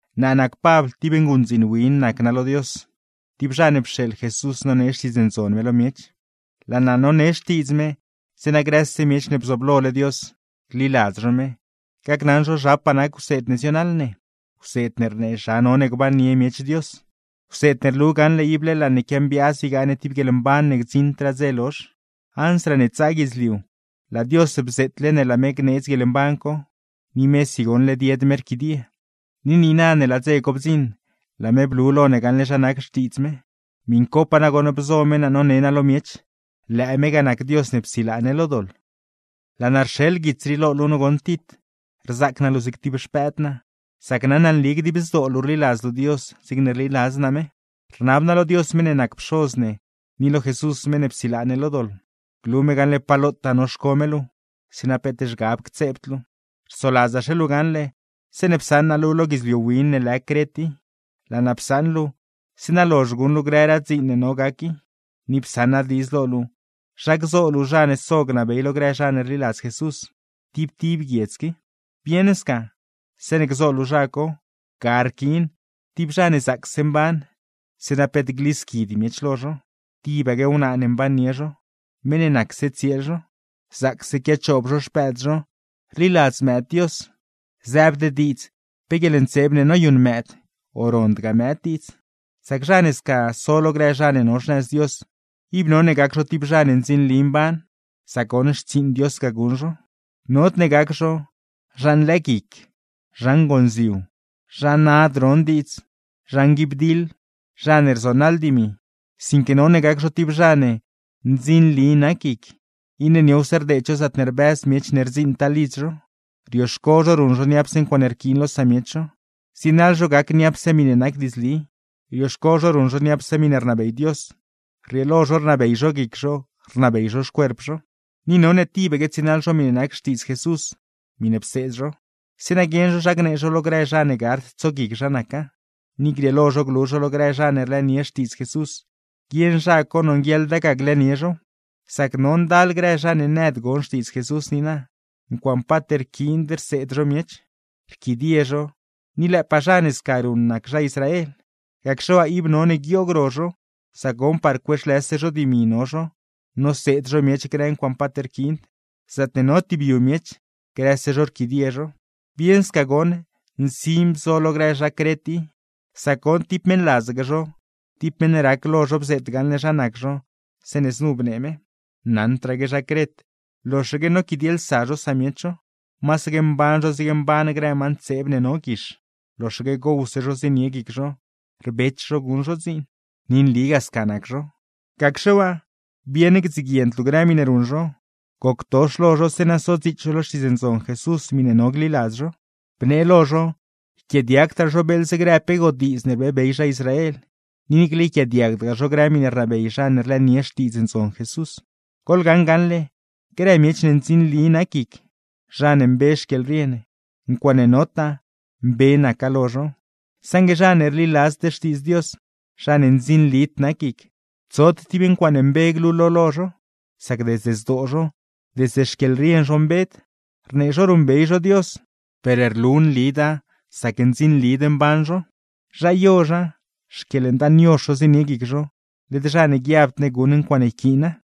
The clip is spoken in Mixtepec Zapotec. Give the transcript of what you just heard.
Naa nac Pabl, tib nguṉdziin win nac naa lo Dios, tib zha ne pxeeḻ Jesús nonee Xtiidz Ndzon me lo miech. Laa naa none xtiidz me, zeeṉa grëse miech ne bzooblole Dios, gliladz zho me, gacnaṉ zho zhapaa nac wseed ne zionaḻ ne (wseed ne rnee zha none gbannie miech Dios), wseed ne rlu gaṉle ible laa ne quiambiaaz ygaa ne tib guieḻmban ne gdziṉdraa dze lozh. Ansraa ne tsaa guidzliu, laa Dios bzeetle ne laa me gneedz guieḻmban co, ni mesi goṉ led yed me rquidie. Ni niina ne laa dze co bdziṉ, laa me blu lo ne gaṉle zha nac xtiidz me, miṉcopaa nagoṉ bzo me naa none naa lo miech. Lëë me ga nac Dios ne psilaa ne lo doḻ. Laa naa rxeḻ guits rii lo luu goṉ Tit. Rzaac naa luu zig tib xpëëd naa, sac naṉ naa nli dib zdoo luu rliladz luu Dios zigne rliladz naa me. Rnab naa lo Dios meṉ ne nac Pxoz ne, ni lo Jesús meṉ ne psilaa ne lo doḻ, glu me gaṉle pa lotaa noxco me luu, zeeṉa peet zhgab ctseebd luu. Rsoladzaxe luu gaṉle, zeeṉe psaṉ naa luu lo guidzliu win ne lë Cret i, laa naa psaṉ luu zeeṉa lozh guṉ luu grëraa dziin ne no gac i, ni psaṉ naa diidz lo luu zha gzo luu zha ne so gnabey lo grë zha ne rliladz Jesús, tib tib guiedz qui. Bieṉ sca, zeeṉe gzo luu zha co, ga rquiin: tib zha ne zaacse mban, zeeṉa peet glisquid miech lo zho; tibaque wnaa ne mbannie zho, meṉ ne nacse tsieel zho, zaacse quiachoob zho xpëëd zho, rliladz mëëd Dios (zëëbd diidz pe guieḻntseeb ne noyuṉ mëëd, o rondgaa mëëd diidz). Sac zha ne sca so lo grë zha ne no xnëz Dios, ib none gac zho tib zha ne ndzinli mban, sac goṉ xtsiiṉ Dios ga guṉ zho. Nodne gac zho: zha nlëëguic, zha ngonziu, zha nad ron diidz, zha nguibdiḻ, zha ne rzonaḻ dimi. Sinque none gac zho tib zha ne: ndzinli nac guic, iṉe niowse rdeed zho zaatne rbëz miech ne rdziṉtaa lidz zho, rioxco zho ruṉ zho niapse ncuaaṉe rquiin lo samiech zho, zienaḻ zho gac niapse miṉe nac diidzli, rioxco zho ruṉ zho niapse miṉe rnabey Dios, rrieelo zho rnabey zho guic zho, rnabey zho xcuerp zho. Ni none tibaque tsienaḻ zho miṉe nac Xtiidz Jesús, miṉe pseed zho; zeeṉa guieṉ zho zha gnee zhow lo grë zha ne gard tsoguic zha naca, ni grieelo zho glu zho lo grë zha ne rlëënie Xtiidz Jesús, guieṉ zha co nonguieḻda ga glëënie zhow. Sac no ndal grë zha ne nëd gon Xtiidz Jesús niina, ncuaaṉe paat rquiind rseed zho miech, rquidie zho; ni lëëpaa zha ne sca ruṉ nac zha Israel. Gacxe waa, ib none guioog ro zho; sac goṉ par cueexlëse zho dimi no zho noseed zho miech grë ncuaaṉe paat rquiind; zaatne no tib yu miech, grëse zho rquidie zho. Bieṉ sca goṉ nsin bzo lo grë zha Cret i. Sac goṉ, tib meṉladzaque zho, tib meṉ rac lo zho bzeet gaṉle zha nac zho zeeṉe znu bnee me: “Naṉdraaque zha Cret, loxaque noquidielsa zho samiech zho. Masaque mban zho zigne mban grë ma ntseeb ne no guix; loxaque gowse zho zienie guic zho, rbech zho guṉ zho dziin.” Ni nligaa sca nac zho. Gacxe waa, bieṉ gdziguiend luu grë miṉe ruṉ zho, goctox lo zho zeeṉa sodziits zho lo Xtiidz Ndzon Jesús miṉe no gliladz zho. Bnee lo zho yquiaadiagdraa zho beeḻze pe grë godiidz ne rbeebey zha Israel, ni niicle yquiaadiagdgaa zho grë miṉe rnabey zha ne rlëënie Xtiidz Ndzon Jesús. Goḻgaṉ gaṉle, grë miech ne ndzinli nac guic, zha ne mbe xquieḻrien, ncuaaṉe notaa, mbe naca lo zho; saṉgue zha ne rliladzd Xtiidz Dios, zha ne ndzinlid nac guic, tsod tib ncuaaṉe mbe glulo lo zho; sac desde zdoo zho, desde xquieḻrien zho mbed. Rnee zho ruṉbey zho Dios, per rlu nlida sac ndzinlid mban zho. Zha yozha, xquieḻndaan yozh zho zienie zho, led zha ne guiabd ne guṉ ncuaaṉe yquiina.